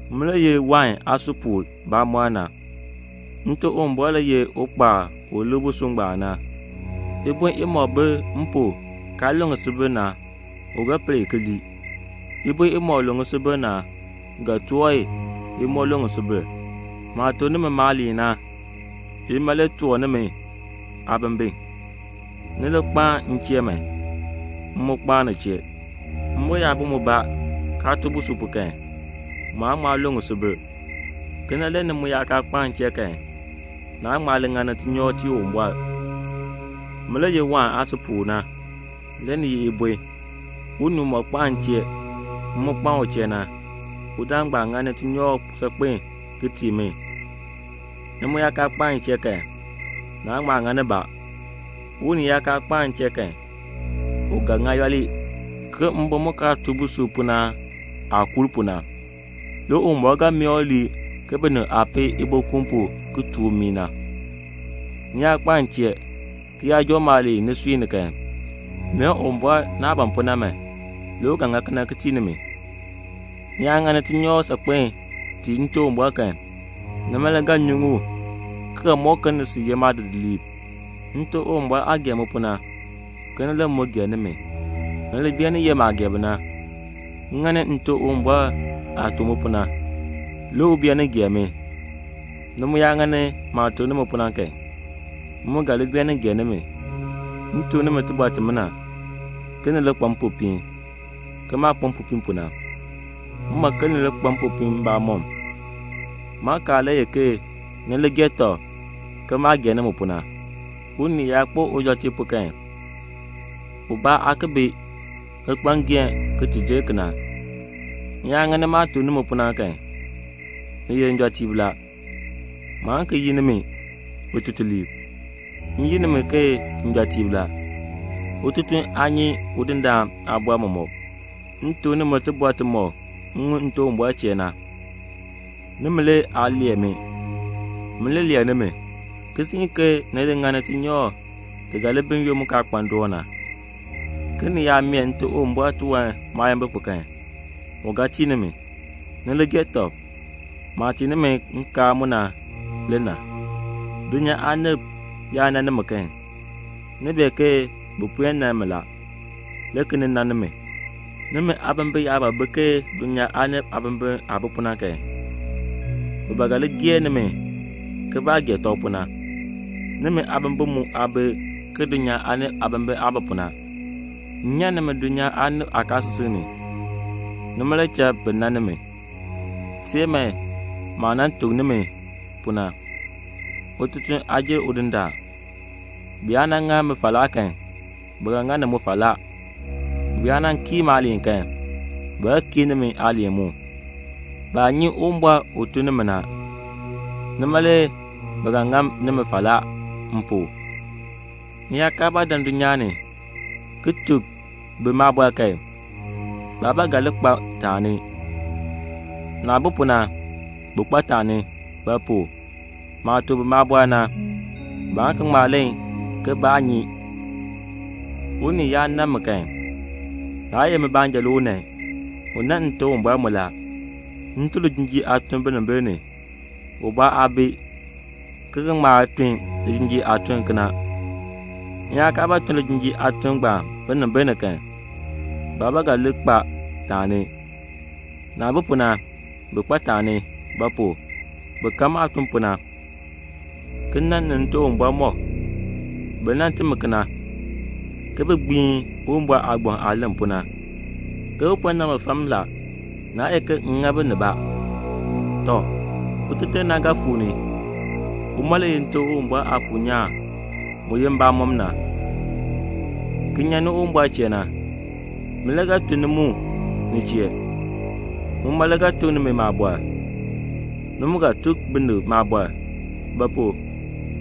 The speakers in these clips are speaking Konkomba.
"Min le ye wain aasupuul bamɔnn na. Nte Uwumbɔr le ye ukpaal u lik busub ngbaan na. Ibon imɔk bi m pu kaa lu ŋisubil na, u ga per i ki lii. Ibon imɔk lu ŋisubil na, u ga toor i, i moo lu ŋisubil. Maah tuk nimi maaliin na, ima le toor nimi aabimbin. Ni li kpaan m chee man, m mu kpaan ni chee. Mbon yaa bi mubaa, kaa tuu busub pu kan, mu aan ŋma lu ŋisubil. Kena le ni mu yaa kaa kpaan m chee kan, naan ŋma li ŋani tinyoor tii Uwumbɔr. "Min le ye wain aasupuul na. Le ni ye ibon. Unii umɔk kpaan m chee, m mu kpaan u chee na, udaan ngbaan ŋani tinyoor saakpen ki tii mi; ni mu yaa kaa kpaan m chee kan, naan ŋma ŋa nibaa. Unii yaa kaa kpaan m chee kan, u ga ŋa yooli, ke mbon mu kaa tuu busub pu na aah kuur pu na. Le Uwumbɔr ga mee u lii ke binib aah peei ibokuun pu ki tuur mmii na. Ni yaa kpaan m chee, ki yaa joo maaliin nisui ni kan, mee Uwumbɔr naah ban pu na man, le u ga ŋa kena ki tii nimi. Ni yaa ŋani tinyoor saakpen tii Nte Uwumbɔr kan, nima le ga nyuŋ u, ki ga mɔk ke ni sil ye maadidiliib. Nte Uwumbɔr aah gee mi pu na, kena le m mu gee nimi. Ni li beenin ye maah gee bi na. M ŋani Nte Uwumbɔr aah tuk mi pu na, le u beenin gee mi. Ni mu yaa ŋani maah tuk nimi pu na kan, m mu ga li beenin gee nimi. "M tuk nimi tibɔr timina, ke ni li kpa mpopiin, ke maah kpa mpopiin pu na. M ban ke ni li kpa mpopiin mbamɔm. Maakaal le ye ke ni li gee tɔb ke maah gee nimi pu na. Unii yaa kpo ujɔtiib pu kan, ubaa aa ki bi, ki kpa ngeehn ki ti jer kena. Ni yaa ŋani maah tuk nimi pu na kan, ni ye njɔtiib la. Maan ki yi nimi bitutuliib; m yi nimi ke njɔtiib la. Ututuln aa nyi udindaan aabɔr mɔmɔk; m tuk nimi tibɔr timɔk m ŋun Nte Uwumbɔr chee na. Nimi le aa lee mi. Min le lee nimi, ki siin ke ni li ŋani tinyoor ti ga li bi n-yoonn mu kaa kpa ndoon na, ke ni yaa mee Nte Uwumbɔr tiwan maayimbil pu kan, u ga tii nimi. Ni li gee tɔb. Maah tii nimi nkaal mu na le na." "Dulnyaa aanib yaa nan nimi kan, ni bee ke bi puen nan mi la, le ki nin nan nimi. Nimi aabimbin yaa ba bi ke dulnyaa aanib aabimbin aah bi pu na kan, bi ba ga li gee nimi ke baah gee tɔb pu na; nimi aabimbin mu aa bi ke dulnyaa aanib aabimbin aah bi pu na. M nyan nimi dulnyaa aanib aakaasisik ni, nima le cha bi nan nimi. Teer man maah nan tuk nimi pu na, 'Ututuln aa jer udindaan.' Bi yaa nan ŋa mi falaa kan, bi ga ŋa ni mu falaa. Bi yaa nan kii maaliin kan, bi ga kii nimi aaliin mu. Baa nyi Uwumbɔr u tun ni mi na. Nima le bi ga ŋa nimi falaa m pu. M yaa kaa ba dan dulnyaa ni ki tuk bi maabɔr kan, baa ba ga li kpa taani; naah bi pu na, bi kpa taani; ba pu? maah tuk bi maabɔr na, baan ki ŋma len ke baa nyi. Unii yaa nan mi kan, naa ye min baanja le u nan, u nan Nte Uwumbɔr mu la. M tun lijinjiir aatun binimbil ni. Ubaa aa bi, ki ga ŋma tun lijinjiir aatun kena. M yaa kaa ba tun lijinjiir aatun ngbaan binimbil ni kan, baa ba ga li kpa taani; naah bi pu na, bi kpa taani; ba pu? bi kan maah tun pu na, ki nan m ni Nte Uwumbɔr mɔk. Bi nan timi kena, ke bi gbiin Uwumbɔr aagbaŋ aah len pu na, ke 'Bi po nan mi fam la, naa ye ke m ŋa bi nibaa.' "Tɔ, Uteter na ga fuu ni. Uma le ye Nte Uwumbɔr Aafuur nyaan mu ye mbamɔn, ki nyan ni Uwumbɔr chee na. Min le ga tun ni mu ni chee. Muma le ga tuk nimi maabɔr. Ni mu ga tuk binib maabɔr; ba pu?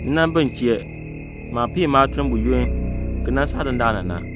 ni nan bi m chee, maah piin maatuln buyoonn ki nan saa dandana na.